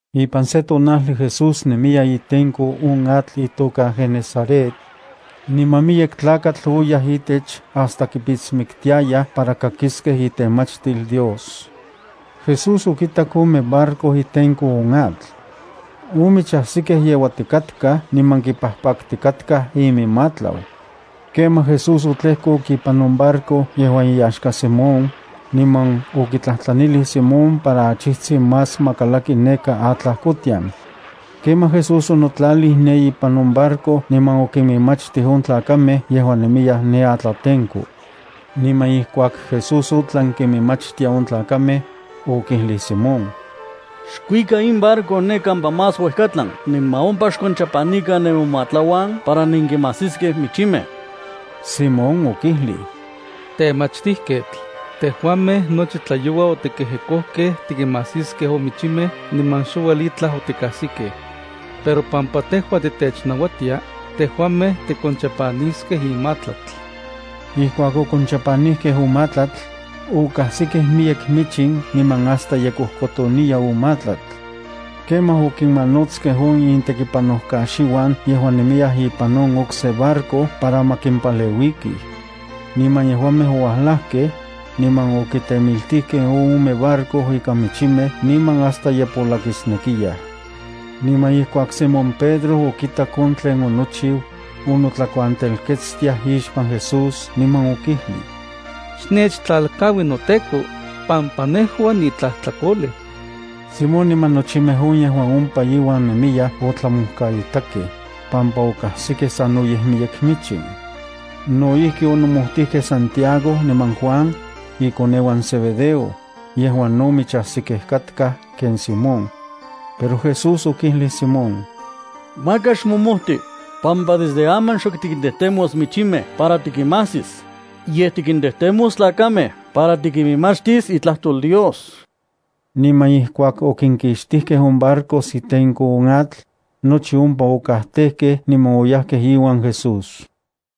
Ipan se tonajli Jesús nemiya itenko on atl itoka Genesaret. Niman miyek tlakatl oyaj itech hasta kipitsmiktiayaj para kakiskej itemachtil Dios. Jesús okitak ome barco itenko on atl. On michajsikej yeuatikatkaj niman kipajpaktikatkaj iminmatlau. Kemaj Jesús otlejkok ipan on barco yejuan iyaxka Simón, niman okitlajtlanilij Simón para achijtsin más ma kalakti neka atlajkotian. Kemaj Jesús onotlalij ne ipan on barco niman okiminmachtij on tlakamej yejuan nemiyaj ne atlatenko. Niman ijkuak Jesús otlan kiminmachtia on tlakamej, okijlij Simón: —Xkuika in barco ne kampa más uejkatlan niman ompa xkonchapanikan nemomatlauan para nenkimajsiskej michimej. Simón okijlij: —Temachtijketl, tejuamej nochi tlayoua otikejekojkej tikimajsiskej on michimej niman xouel itlaj otikajsikej. Pero pampa tejua titechnauatia, tejuamej tikonchapaniskej in matlatl. Ijkuak okonchapanijkej on matlatl, okajsikej miyek michin niman hasta ye kojkotoniya on matlatl. Kemaj okinmanotskej on intekipanojkaxiuan yejuan nemiyaj ipan on okse barco para ma kimpaleuikij. Niman yejuamej oualajkej, niman okitemiltijkej on ome barco ikan michimej niman hasta ye polakisnekiyaj. Niman ijkuak Simón Pedro okitak on tlen onochiu, onotlakuantelketstiaj ixpan Jesús niman okijlij: —Xnechtlalkaui noTEKO, pampa nejua nitlajtlakolej. Simón niman nochimej on yejuan ompa iuan nemiyaj otlamojkaitakej, pampa okajsikej sanoyej miyek michin. No ijki onomojtijkej Santiago niman Juan, ikoneuan Zebedeo, yejuan no michajsikej katkaj ken Simón. Pero Jesús okijlij Simón: —Maka xmomojti, pampa desde aman xok tikintejtemos michimej para tikinmajsis, yej tikintejtemos tlakamej para tikiminmachtis itlajtol Dios. Niman ijkuak okinkixtijkej on barcos itenko on atl, nochi ompa okajtejkej niman oyajkej iuan Jesús.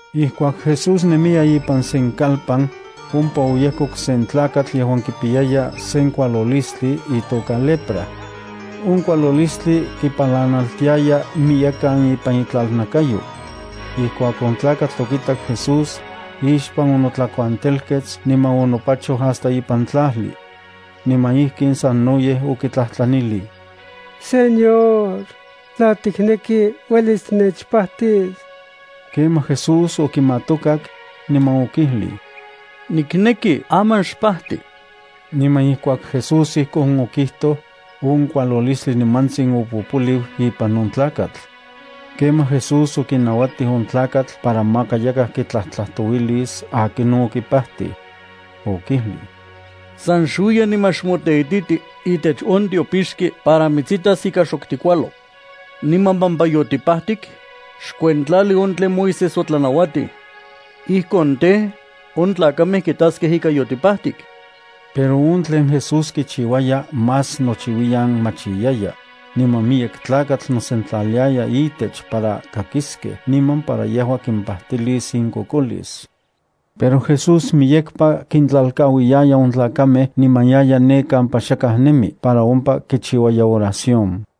Ijkuak Jesús nemiya ipan sen kalpan, ompa oyejkok sen tlakatl yejuan kipiyaya sen kualolistli itoka lepra. On kualolistli kipalanaltijtiaya miyekan ipan itlalnakayo. Ijkuak on tlakatl okitak Jesús, ixpan onotlakuantelkets niman onopachoj hasta ipan tlajli. Niman ijkin sanoyej okitlajtlanilij: —Señor, tla tikneki, uelis tinechpajtis. Kemaj Jesús okimatokak, niman okijlij: —Nikneki. Aman xpajti. Niman ijkuak Jesús ijkon okijtoj, on kualolistli nimantsin opopoliu ipan on tlakatl. Kemaj Jesús okinauatij on tlakatl para maka yakaj kitlajtlajtouilis akinon okipajtij. Okijlij: —San xuiya niman xmoteititi itech on tiopixki para mitsitas ika xok tikualo. Niman pampa yotipajtik, xkuentlali on tlen Moisés otlanauatij. Ijkon tej, on tlakamej kitaskej ika yotipajtik. Pero on tlen Jesús kichiuaya más nouiyan machiyaya, niman miyek tlakatl nosentlaliaya itech para kakiskej niman para yejua kimpajtilis inkokolis. Pero Jesús miyekpa kintlalkauiyaya on tlakamej niman yaya ne kampa xakaj nemi para ompa kichiuaya oración.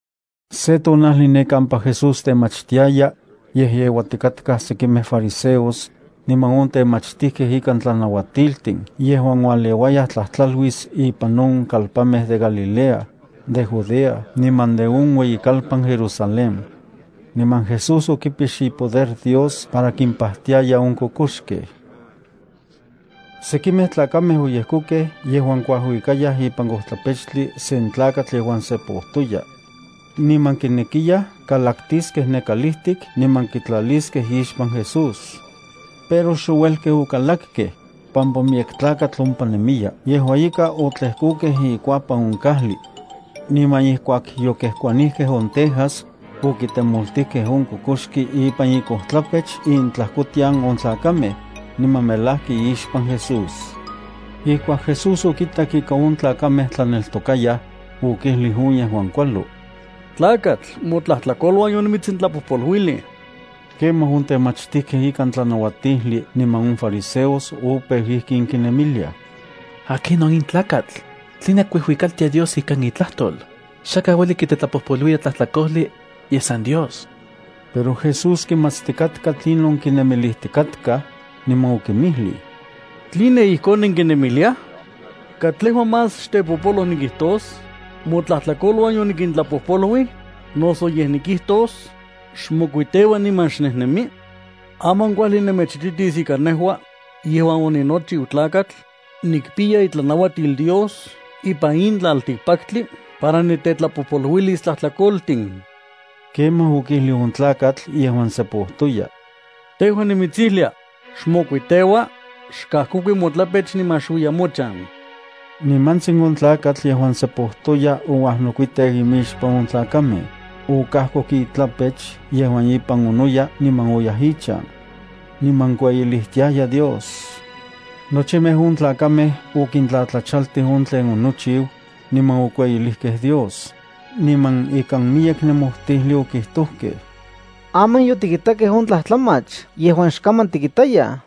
Se tonajli ne kampa Jesús temachtiaya, yejyeuatikatkaj sekimej fariseos niman on temachtijkej ikan tlanauatiltin yejuan ualeuayaj tlajtlaluis ipan on kalpanmej de Galilea, de Judea niman no de on ueyikalpan Jerusalén. Niman Jesús okipix ipoder Dios para kimpajtiaya on kokoxkej. Sekimej tlakamej oyejkokej yejuan kuajuikayaj ipan kojtlapechtli sen tlakatl yejuan sepojtoya. Niman kinekiyaj kalaktiskej ne kalijtik niman kitlaliskej ixpan Jesús. Pero xouelkej okalakkej, pampa miyek tlakatl ompa nemiya. Yejua ika otlejkokej ikuapan on kajli. Niman ijkuak yokejkuanijkej on tejas, okitemoltijkej on kokoxki ipan ikojtlapech intlajkotian on tlakamej, niman melajki ixpan Jesús. Ijkuak Jesús okitak ika on tlakamej tlaneltokayaj, okijlij on yejuan kualo: —Tlakatl, motlajtlakoluan yonimitsintlapojpoluilij. Kemaj on temachtijkej ika tlanauatijli niman on fariseos opeu ijkin kinemiliaj: “¿Akinon in tlakatl? ¿Tline kuijuikaltia Dios ikan itlajtol? Xakaj ueli kitetlapojpoluilia tlajtlakojli, yej san Dios.” Pero Jesús kimatstikatka tlinon kinemilijtikatkaj, niman okinmijlij: —¿Tline ijkon nenkinemiliaj? ¿Katlejua más xtepopoloj nikijtos: “Motlajtlakoluan yonitlapojpoluilokej”, noso yej nikijtos: “Xmokuiteua niman xnejnemi”? Aman kuajli nejua nemechititis ika nejua, yejuan oninochiu Tlakatl, nikpiya itlanauatil Dios ipan in tlaltikpaktli para nitetlapojpoluilis tlajtlakoltin. Kemaj okijlij on tlakatl yejuan sepojtoya: —Tejua nimitsijlia, xmokuiteua, xkajkokui motlapech niman xuiya mochan. Nimantsin on tlakatl yejuan sepojtoya ouajnokuiteu imixpan on tlakamej, okajkoku itlapech yejuan ipan onoya niman oyaj ichan. Niman kueyilijtiaya Dios. Nochimej on tlakamej okintlatlachaltij on tlen onochiu, niman okueyilijkej Dios, niman ikan miyek nemojtijli okijtojkej: —Aman yotikitakej on tlajtlamach yejuan xkaman tikitayaj.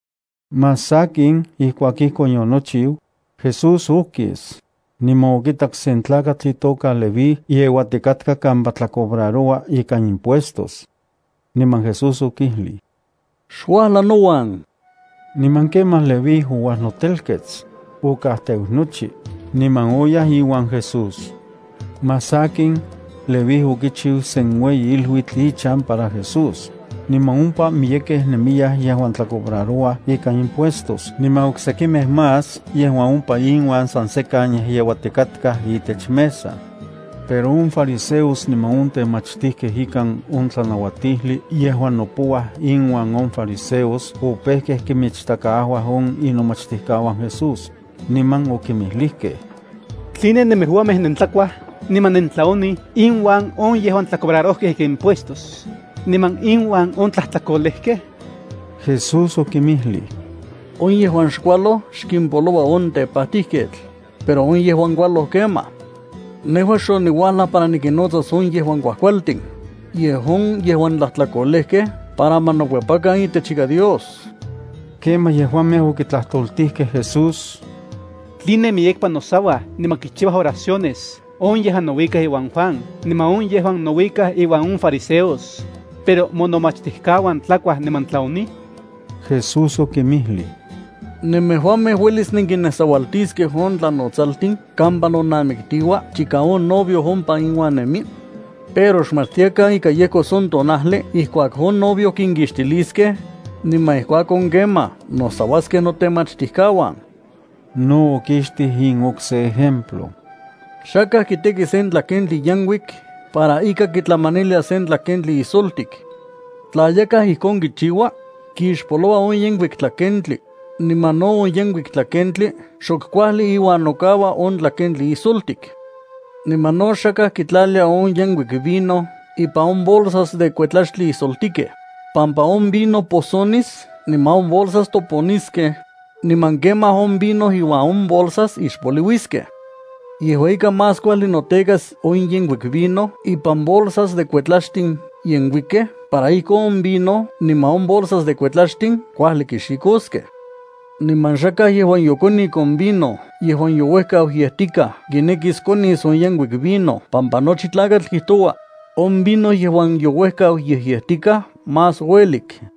Más sakin ijkuak ijkon yonochiu, Jesús okis, niman okitak sen tlakatl itoka Leví yeuatikatka kampa tlacobraroua ikan impuestos. Niman Jesús okijlij: —Xuajla nouan. Niman kemaj Leví ouajnotelkets, okajteu nochi, niman oyaj iuan Jesús. Más sakin, Leví okichiu sen ueyi iluitl ichan para Jesús, niman ompa miyekej nemiyaj yejuan tlacobrarouaj ikan impuestos niman oksekimej más yejuan ompa inuan san sekan yejyeuatikatkaj itech mesa. Pero on fariseos niman on temachtijkej ikan on tlanauatijli yejuan nopouaj inuan on fariseos opejkej kinmichtakaajuaj on inomachtijkauan Jesús, niman okinmijlijkej: —¿Tline nemejuamej nentlakuaj niman nentlaonij inuan on yejuan tlacobrarojkej ika impuestos, niman inuan on tlajtlakolejkej? Jesús okinmijlij: —On yejuan xkualoj xkimpoloua on tepajtijketl, pero on yejuan kualoj kemaj. Nejua xoniuajlaj para nikinnotsas on yejuan kuajkualtin, yej on yejuan tlajtlakolejkej para ma nokuepakan itechika Dios. Kemaj yejuamej okitlajtoltijkej Jesús: —¿Tline miyekpa nosauaj niman kichiuaj oraciones on yejuan nouikaj iuan Juan niman on yejuan nouikaj iuan on fariseos, pero monomachtijkauan tlakuaj niman tlaonij? Jesús okinmijlij: —¿Nemejuamej uelis nenkinnesaualtiskej on tlanotsaltin kampa nonamiktiua chika on novio ompa inuan nemi? Pero xmatstiakan ika yejkos on tonajli ijkuak on novio kinkixtiliskej, niman ijkuakon kemaj nosauaskej notemachtijkauan. No okixtij in okse ejemplo: —Xakaj kiteki sen tlakentli yenkuik para ika kitlamanilia sen tlakentli ijsoltik. Tla yakaj ijkon kichiua, kixpoloua on yenkuik tlakentli, niman no on yenkuik tlakentli xok kuajli iuan nokaua on tlakentli ijsoltik. Niman no xakaj kitlalia on yenkuik vino ipan on bolsas de kuetlaxtli ijsoltikej, pampa on vino posonis niman on bolsas toponiskej, niman kemaj on vino iuan on bolsas ixpoliuiskej. Yejua ika más kuajli notekas on yenkuik vino ipan bolsas de kuetlaxtin yenkuikej para ijkon on vino niman on bolsas de kuetlaxtin kuajli kixikoskej. Niman xakaj yejuan yokonik on vino yejuan youejkau yetikaj kinekis konis on yenkuik vino pampa nochi tlakatl kijtoua: “On vino yejuan youejkau yejyejtikaj, más uelik.”